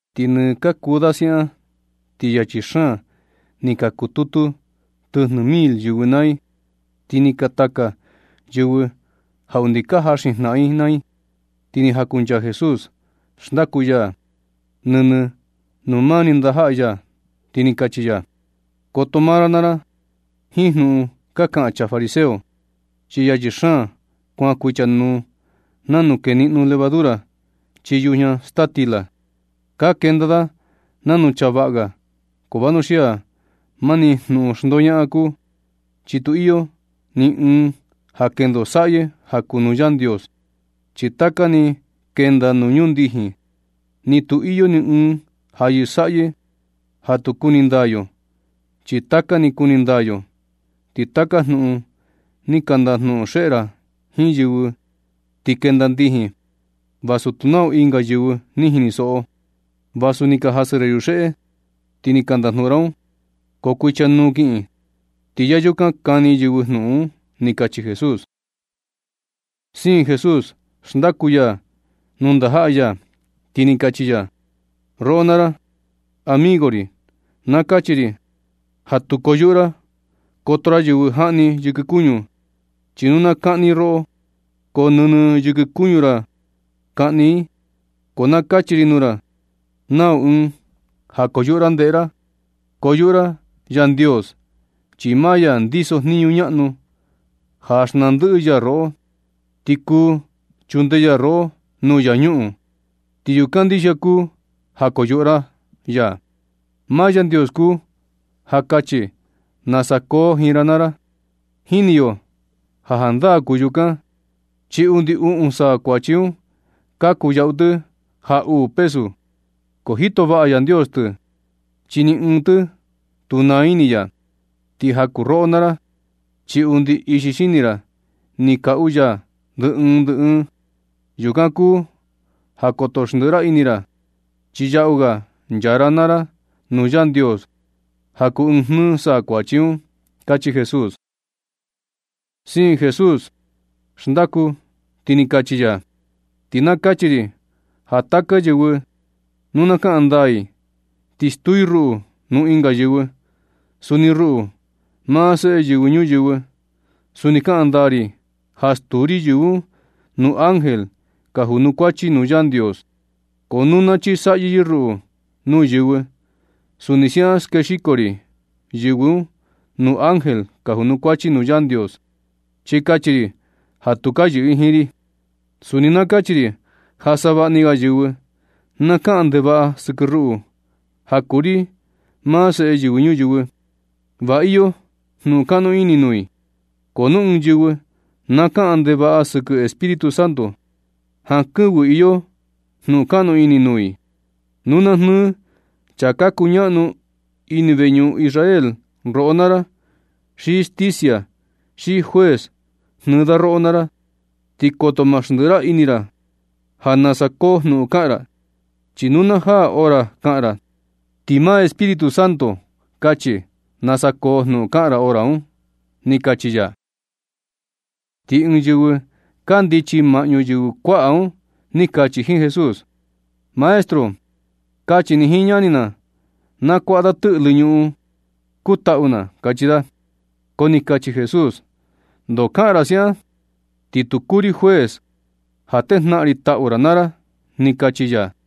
Ti nɨ kakuu da siaꞌan ti yachi xaan ni ka kututu tɨjnɨ mil yɨvɨ naa i, ti ni ka taka yɨvɨ ja undi ka jaxin jnaꞌan i naa i. Ti ni jakunchaa Jesús xndaku ya nɨnɨ nuu maa ni ndajaꞌa ya, ti ni kachi ya: ―Koto maa ra naa ra jiin jnuꞌun ka kaꞌan chaa fariseo, chi yachi xaan kuan kuichanuu nanu keniꞌno levadura chii yujña staa stila. Ka kenda da nanu chaa vaꞌa ga, ko vanuxia mani jnuꞌun xndoñaꞌan kuu. Chi tu iyo nɨ ɨɨn ja kendo saꞌyɨ ja kuu nuu Yandios, chi taka ni kenda nuu ndijin. Ni tu iyo ni ɨɨn ja yɨsaꞌyɨ ja tu kuni ndaa yo, chi taka ni kuni ndaa yo. Ti taka jnuꞌun ni ka ndajnuꞌun xeꞌe ra jiin yɨvɨ, ti kenda ndijin vasu tu nau ɨnga yɨvɨ ni jinisoꞌo. Vasu ni ka jasɨ ra yuxeꞌe, ti ni ka ndajnuꞌun ra un, ko kuichanuu kiꞌin, ti ya yukan kani yɨvɨ jnuꞌun un ―ni kachi Jesús. Siin Jesús xndaku ya nuu ndajaꞌa ya, ti ni kachi ya: ―Roꞌo naa ra, amigo ri, na kachi ri ja tu koyuꞌu ra koto ra yɨvɨ jaꞌni yɨkɨ kuñu, chi nu na kaꞌni i roꞌo ko nɨnɨ yɨkɨ kuñu ra kaꞌni i. Ko na kachi ri nuu ra nau ɨɨn ja koyuꞌu ra ndeꞌe ra. Koyuꞌu ra Yandios, chi maa ya ndiso jniñu ñaꞌnu ja xnaa ndɨꞌɨ ya roꞌo, ti kuu chunde ya roꞌo nuu infiernu. Ti yukan ndixia kuu ja koyuꞌu ra ya. Maa Yandios kuu ja kachi nasa koo jiin ra naa ra. Jini yo ja jandaa kuu yukan, chi undi uꞌun saa kuachi un, ka kuyaꞌu tɨ ja uu pesu, ko jito vaꞌa Yandios tɨ, chi ni ɨɨn tɨ tu naa ini ya. Ti ja kuu roꞌo naa ra, chi undi ixi xini ra ni kaꞌu ya ndɨ ɨɨn ndɨ ɨɨn. Yukan kuu ja koto xndiꞌi ra ini ra chi yaꞌu ga nchaa ra naa ra nuu Yandios ja kuu ɨɨn jnɨɨ saa kuachi un ―kachi Jesús. Siin Jesús xndaku, ti ni kachi ya: ―Ti na kachi ri ja taka yɨvɨ nu na kaꞌan ndaa i, ti stuu i ruꞌu nuu ɨnga yɨvɨ, suni ruꞌu, maa Seꞌe Yɨvɨ Ñuyɨvɨ, suni kaꞌan ndaa ri ja stuu ri yɨvɨ un nuu ángel ka junukuachi nuu Yandios. Ko nu na chisaꞌyɨ i ruꞌu nuu yɨvɨ, suni siaꞌan skexiko ri yɨvɨ un nuu ángel ka junukuachi nuu Yandios, chi kachi ri ja tu ka yɨꞌɨ i jiin ri. Suni na kachi ri ja savaꞌa ni ga yɨvɨ na kaꞌan ndevaꞌa sɨkɨ ruꞌu, ja kuu ri maa Seꞌe Yɨvɨ Ñuyɨvɨ, va iyo jnuꞌun kaꞌnu ini nuu i. Ko nu ɨɨn yɨvɨ na kaꞌan ndevaꞌa sɨkɨ Espíritu Santo, jankɨvɨ iyo jnuꞌun kaꞌnu ini nuu i. Nu na jnɨɨ chaa ka kuñaꞌnu ini veñuꞌun Israel roꞌo naa ra, xi stisia, xi juez jnɨɨ da roꞌo naa ra, ti koto ma xndiꞌi ra ini ra naa ra ja nasa koo jnuꞌun kaꞌan ra. Chi nu na jaa hora kaꞌan ra, ti maa Espíritu Santo kachi nasa koo jnuꞌun kaꞌan ra hora un ―ni kachi ya. Ti ɨɨn yɨvɨ kandichi maꞌñu yɨvɨ kuaꞌa un ni kachi jiin Jesús: ―Maestro, kachi ni jiin ñani na, na kuaꞌa da tɨꞌlɨ ñuꞌun kuu taꞌu na ―kachi da. Ko ni kachi Jesús: ―¿Ndoo kaꞌan ra siaꞌan? Ti tu kuu ri juez ja tejnaꞌan ri taꞌu ra naa ra ―ni kachi ya.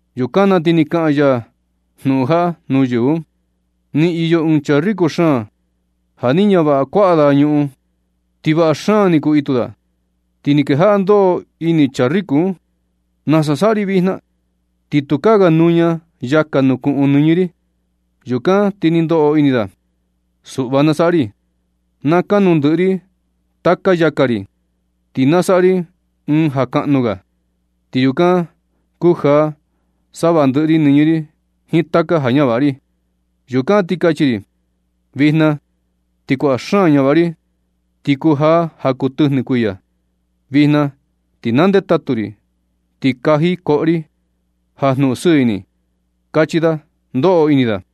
Yukan na ti ni kaꞌan ya jnuꞌun jaꞌa nuu yɨvɨ un: ―Ni iyo ɨɨn chaa riko xaan ja ni ñavaꞌa kuaꞌa da ñuꞌun, ti vaꞌa xaan ni kuu itu da. Ti ni kejaꞌa ndoꞌo ini chaa riko un: “¿Nasa saꞌa ri vijna? Ti tukaa ga nuña yaka nuu kuꞌun nɨñɨ ri.” Yukan ti ni ndoꞌo ini da: “Suꞌva na saꞌa ri. Na kanu ndɨꞌɨ ri taka yaka ri, ti na saꞌa ri ɨɨn ja kaꞌnu ga, ti yukan kujaa savaꞌa ndɨꞌɨ ri nɨñɨ ri jiin taka ja ñavaꞌa ri. Yukan ti kachi ri: Vijna ti kuaꞌa xaan ja ñavaꞌa ri ti kujaa ja kuu tɨjnɨ kuiya. Vijna ti na ndetatu ri, ti kaji koꞌo ri ja jnuꞌun sɨɨ ini”, kachi da, ndoꞌo ini da.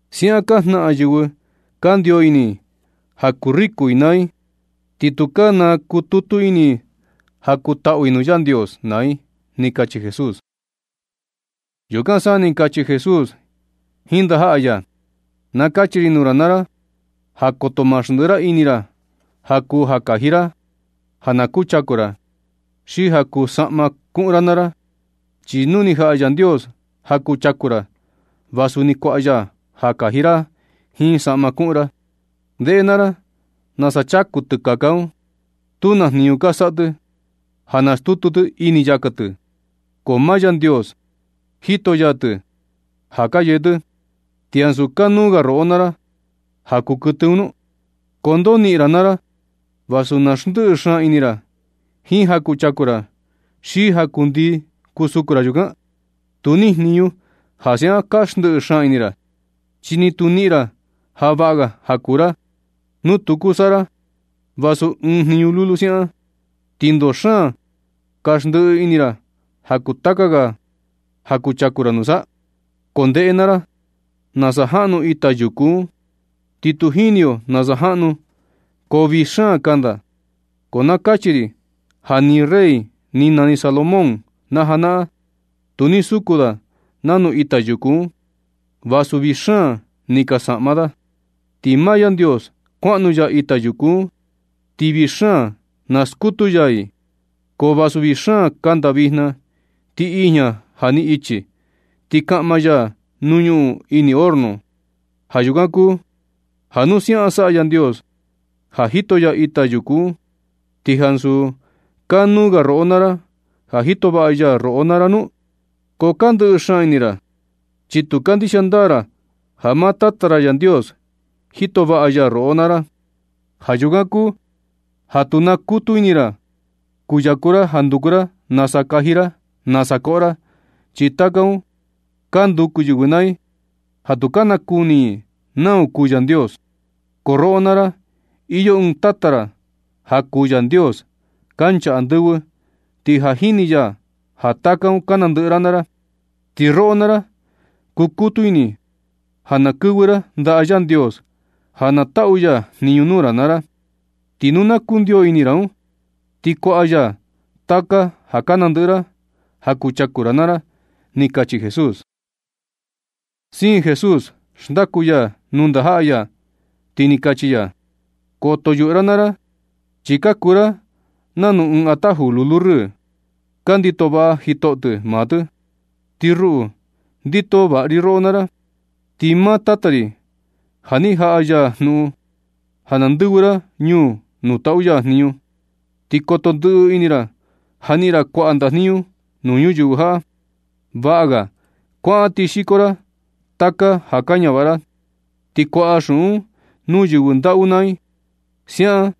Siaꞌan ka jnaꞌan yɨvɨ kandio ini ja kuu riku i naa i, ti tu ka nakututu ini i ja kuu taꞌu i nuu Yandios, naa i ―ni kachi Jesús. Yukan sa ni kachi Jesús jiin ndajaꞌa ya: ―Na kachi ri nuu ra naa ra, ja koto maa xndiꞌi ra ini ra ja kuu ja kaji ra, ja na kuchaku ra, xi ja kuu saꞌma kuꞌun ra naa ra. Chi nu ni jaꞌa Yandios ja kuchaku ra, va suni kuaꞌa ya ja kaji ra jiin saꞌma kuꞌun ra. Ndeꞌe naa ra nasa chaku tɨkaka un. Tu naa jniñu ka saꞌa tɨ ja nastutu tɨ ini yaka tɨ, ko maa Yandios jito ya tɨ ja ka yee tɨ. ¿Ti ansu kanuu ga roꞌo naa ra ja kuu kuɨtɨ un nu? ¿Ko ndoo niꞌin ra naa ra vasu na xndiꞌi xaan ini ra jiin ja kuchaku ra, xi ja kundii kusuku ra yukan? Tu nijniñu ja siaꞌan ka xndiꞌi xaan ini ra, chi ni tu niꞌin ra ja vaꞌa ga ja kuu ra. Nu tu kuu saꞌa ra vasu ɨɨn jniñu lulu siaꞌan, ¿ti ndoo xaan ka ndɨꞌɨ ini ra ja kuu taka ga ja kuchaku ra nusa? Ko ndeꞌe naa ra, nasa jaꞌnu ita yuku un, ti tu jini yo nasa jaꞌnu, ko vii xaan kanda. Ko na kachi ri ja ni rey ni nani Salomón na janaꞌan, tu ni suku da nanu ita yuku un, vasu vii xaan ni kaa saꞌma da. Ti maa Yandios skuaꞌnu ya ita yuku un, ti vii xaan na skutu ya i. Ko vasu vii xaan kanda vijna, ti ijña ja ni ichi, ti kaꞌma ya nuu ñuꞌun ini horno. Ja yukan kuu ja nu siaꞌan saꞌa Yandios, ja jito ya ita yuku un, ¿ti ansu kanuu ga roꞌo naa ra ja jito vaꞌa ya roꞌo naa ra nu? Ko ka ndɨꞌɨ xaan ini ra, chi tu kandixia ndaa ra ja maa Tata ra Yandios jito vaꞌa ya roꞌo naa ra. Ja yukan kuu ja tu nakukutu ini ra kuyaku ra ja nduku ra nasa kaji ra, nasa koꞌo ra. Chi taka un ka nduku yɨvɨ naa i ja tu ka nakuni i nau kuu Yandios, ko roꞌo naa ra, iyo ɨɨn Tata ra ja kuu Yandios kancha andɨvɨ, ti ja jini ya ja taka un ka nandɨꞌɨ ra naa ra. Ti roꞌo naa ra kukutu ini ja na kɨvɨ ra ndaꞌa Yandios ja na taꞌu ya jniñu nuu ra naa ra. Ti nu na kundio ini ra un, ti kuaꞌa ya taka ja ka nandɨꞌɨ ra ja kuchaku ra naa ra ―ni kachi Jesús. Siin Jesús xndaku ya nuu ndajaꞌa ya, ti ni kachi ya: ―Koto yuꞌu ra naa ra chi ka kuu ra nanu ɨɨn ataju lulu rɨɨ, ja ndito vaꞌa jitoꞌo tɨ maa tɨ, ti ruꞌu ndito vaꞌa ri roꞌo naa ra. Ti maa Tata ri ja ni jaꞌa ya jnuꞌun ja na ndɨvɨ ra ñuu nuu taꞌu ya jniñu. Ti koto xndiꞌi ini ra ja niꞌin ra kuaꞌa ndajniñu nuu ñuyɨvɨ jaꞌa. Vaꞌa ga kuaꞌan ti xiko ra taka ja ka ñavaꞌa ra, ti kuaꞌa xuꞌun un nuu yɨvɨ ndaꞌu naa i. Siaꞌan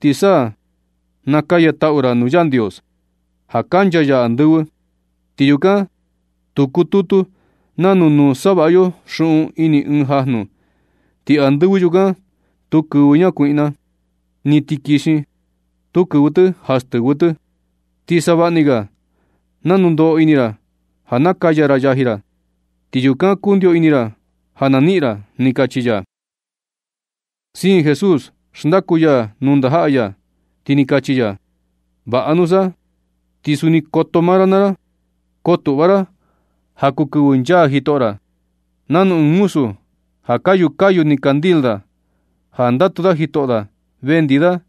ti sa nakaya taꞌu ra nuu Yandios ja kancha ya andɨvɨ, ti yukan tu kututu nanu nu savaꞌa yo xuꞌun ini ɨɨn jajnu. Ti andɨvɨ yukan tu kɨvɨ ñakuiꞌna, ni tikixin tu kɨvɨ tɨ ja stɨvɨ tɨ. Ti savaꞌni ga nanu ndoꞌo ini ra ja nakaya ra yaji ra, ti yukan kundio ini ra ja na niꞌin ra ―ni kachi ya. Siin Jesús xndaku ya nuu ndajaꞌa ya, ti ni kachi ya: ―Vaꞌa nusa, ti suni koto maa ra naa ra, kotuꞌva ra ja kuu kɨvɨ nchaa jitoꞌo ra, nanu ɨɨn muzu ja kayu kayu ni candil da, ja ndatu da jitoꞌo da vendi da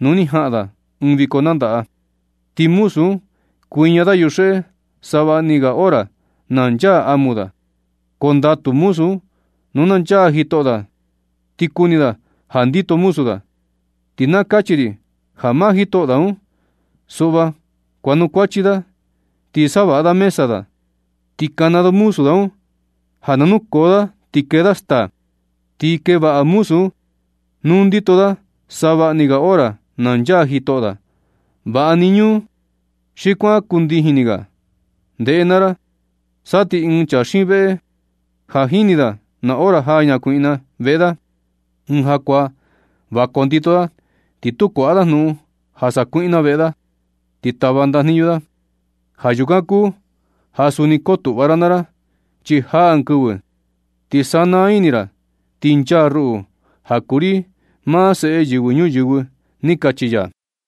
nu ni jaꞌan da ɨɨn viko nandaꞌa. Ti muzu un kuiña da yuxeꞌe savaꞌni ga hora na nchaa amu da. Ko ndatu muzu un, nu na nchaa jitoꞌo da ti kuni da ja ndito muzu da. Ti na kachi ri ja maa jitoꞌo da un, suꞌva kuanukuachi da, chi savaꞌa da mesa da, ti kana da muzu da un ja na nukoo da ti kee da staa. Ti kee vaꞌa muzu un nu ndito da savaꞌni ga hora na nchaa jitoꞌo da, vaꞌa ni ñuu, xi kuan ndii ni ga. Ndeꞌe naa ra, sa ti ɨɨn chaa xiin veꞌe ja jini da na hora jaa ñakuiꞌna veꞌe da ɨɨn jakuaa, va kondito da, ti tu kuaꞌa da jnuꞌun ja sakuiꞌna veꞌe da, ti tava ndajniñu da. Ja yukan kuu ja suni kotuꞌva ra naa ra, chi jaa ɨɨn kɨvɨ, ti sana ini ra, ti nchaa ruꞌu, ja kuu ri maa Seꞌe Yɨvɨ Ñuyɨvɨ ―ni kachi ya.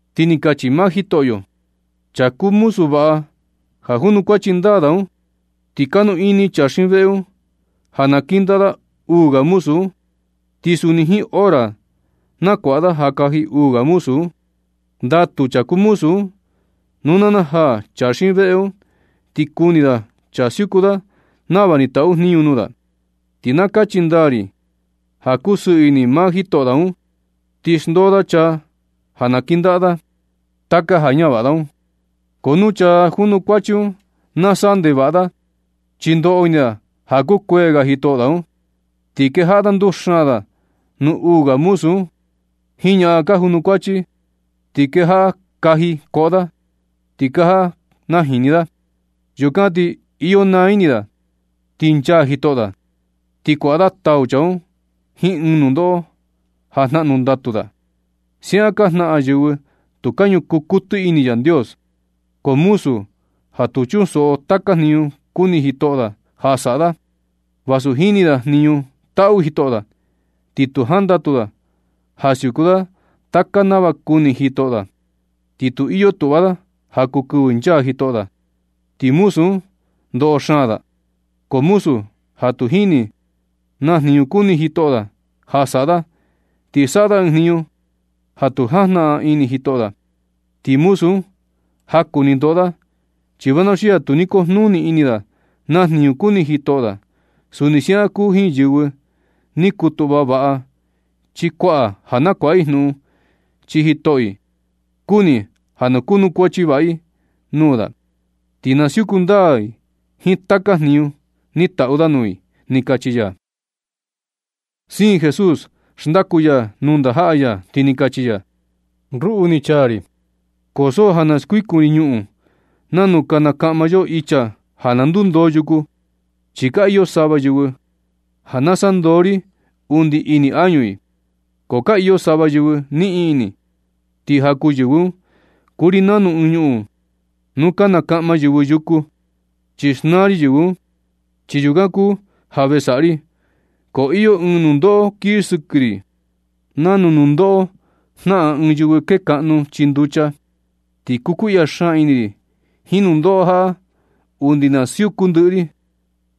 Ti ni kachi maa Jitoꞌyo: ―Chaa kuu muzu vaꞌa ja junukuachi ndaa un, ti kanu ini chaa xiin veꞌe un ja na kɨndaꞌa da uu ga muzu un, ti suni jiin hora na kuaꞌa da ja kaji uu ga muzu un. Ndatu chaa kuu muzu un nu na najaa chaa xiin veꞌe un, ti kuni da chaa siuku da nava ni taꞌu jniñu nuu da. Ti na kachi ndaa ri ja kusɨɨ ini maa jitoꞌo da un, ti xndoo da chaa ja na kɨndaꞌa da taka ja ñavaꞌa da un. Ko nu chaa junukuachi un na saꞌa ndevaꞌa da, chi ndoꞌo ini da ja kukuee ga jitoꞌo da un, ti kejaꞌa nduxaan da nuu uu ga muzu un, jiin ñaꞌan ka junukuachi, ti kejaꞌa kaji koꞌo da ti kejaꞌa najini da. Yukan ti iyo naa ini da ti nchaa jitoꞌo da. Ti kuaꞌa da tau chaa un jiin ɨɨn nundoꞌo ja jnaꞌnu ndatu da. Siaꞌan ka jnaꞌan yɨvɨ tu ka ñukuu kuɨtɨ ini i Yandios. Ko muzu ja tu chunsoꞌo taka jniñu kuni jitoꞌo da ja saꞌa da, vasu jini da jniñu taꞌu jitoꞌo da, ti tu jandatu da ja siuku da taka nava kuni jitoꞌo da, ni tu iyo tuꞌva da ja kuu kɨvɨ nchaa jitoꞌo da. Ti muzu un, ndoꞌo xaan da. Ko muzu ja tu jini na jniñu kuni jitoꞌo da ja saꞌa da, ti saꞌa da ɨɨn jniñu ja tu jajnaꞌan ini jitoꞌo da, ti muzu un jaku ni ndoꞌo da. Chi vanuxia tu ni kujnuni ini da naa jniñu kuni jitoꞌo da. Suni siaꞌan kuu jiin ɨɨn yɨvɨ ni kutuꞌva vaꞌa chi kuaꞌa ja nakuaꞌa i jnuꞌun, chi jitoꞌo i kuni ja na kuanukuachi vaꞌa i nuu da, ti na siuku ndaa i jiin taka jniñu ni taꞌu da nuu i ―ni kachi ya. Siin Jesús xndaku ya nuu ndajaꞌa ya, ti ni kachi ya: ―Ruꞌu ni chaa ri, ko so ja na skuikun ri ñuꞌun, nanu ka nakaꞌma yo icha ja na ndundoo yuku. Chi ka iyo sava yɨvɨ ja nasaꞌa ndoo ri undi ini añu i, ko ka iyo sava yɨvɨ niꞌin ini, ti ja kuu yɨvɨ un, kuu ri nanu ɨɨn ñuꞌun nuu ka nakaꞌma yɨvɨ yuku, chi xnaa ri yɨvɨ un. Chi yukan kuu ja ve saꞌa ri. Ko iyo ɨɨn nundoꞌo kii sɨkɨ ri, nanu nundoꞌo jnaꞌan ɨɨn yɨvɨ kekaꞌnu chii nducha. Ti kukuiꞌya xaan ini ri jiin nundoꞌo jaꞌa undi na siuku ndɨꞌɨ ri.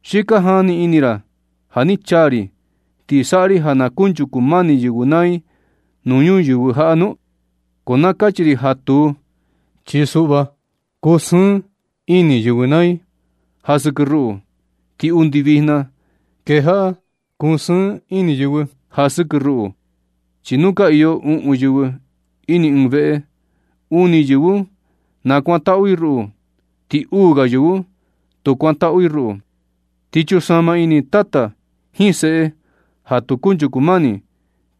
¿Xi ka jani ini ra ja ni chaa ri, ti saꞌa ri ja na kunchuku mani yɨvɨ naa i nuu ñuyɨvɨ jaꞌa nu? Ko na kachi ri ja tuu. Chi suꞌva kusɨɨn ini yɨvɨ naa i ja sɨkɨ ruꞌu. Ti undi vijna kejaꞌa kusɨɨn ini yɨvɨ ja sɨkɨ ruꞌu. Chi nu ka iyo uꞌun yɨvɨ ini ɨɨn veꞌe, uni yɨvɨ un kuantaꞌu i ruꞌu, ti uu ga yɨvɨ un, tu kuantaꞌu i ruꞌu. Ti chunsama ini tata jiin seꞌe ja tu kunchuku mani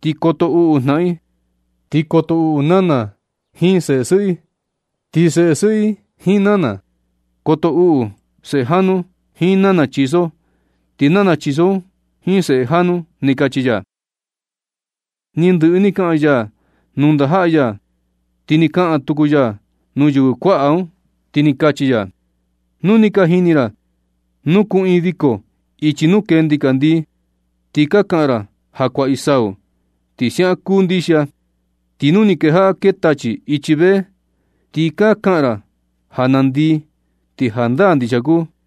ti koto uꞌu jnaꞌan i. Ti koto uꞌu nana jiin seꞌe sɨꞌɨ, ti seꞌe sɨꞌɨ jiin nana. Koto uꞌu seꞌe janu un jiin nana chiso, ti nana chiso un jiin seꞌe janu ―ni kachi ya. Ni ndɨꞌɨ ni kaꞌan ya nuu ndajaꞌa ya, ti ni kaꞌan tuku ya nuu yɨvɨ kuaꞌa un. Ti ni kachi ya: ―Nu ni ka jini ra nuu kuꞌiin viko ichi nuu kee ndikandii, ti ka kaꞌan ra ja kuaꞌi sau, ti siaꞌan kuu ndixia. Ti nu ni kejaꞌa kee tachi ichi vee, ti ka kaꞌan ra ja nandii, ti jandaa ndixia kuu.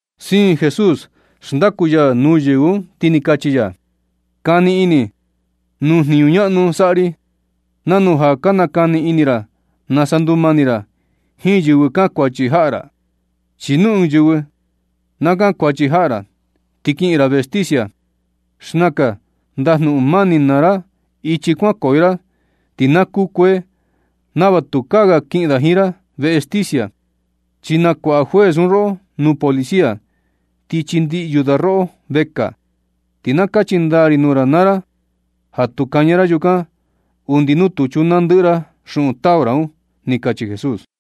Siin xndaku Jesús nuu yɨvɨ un, ti ni kachi ya: ―Kani ini nuu jniñu ñaꞌnu saꞌa ri, nanu ja ka nakani ini ra nasa ndumani ra jiin yɨvɨ kankuachi jaꞌa ra. Chi nu ɨɨn yɨvɨ na kankuachi jaꞌa ra, ti kiꞌin ra veꞌe sticia. Xnakan ndajnuꞌun mani naa ra ichi kuankoyo ra ti na kukuee, nava tukaa ga kiꞌin da jiin ra veꞌe sticia, chi nakuaꞌa juez un roꞌo nuu policia, ti chindiꞌyu da roꞌo vekaa. Ti na kachi ndaa ri nuu ra naa ra ja tu kaña ra yukan undi nu tu chunaa ndɨꞌɨ ra xuꞌun tau ra un ―ni kachi Jesús.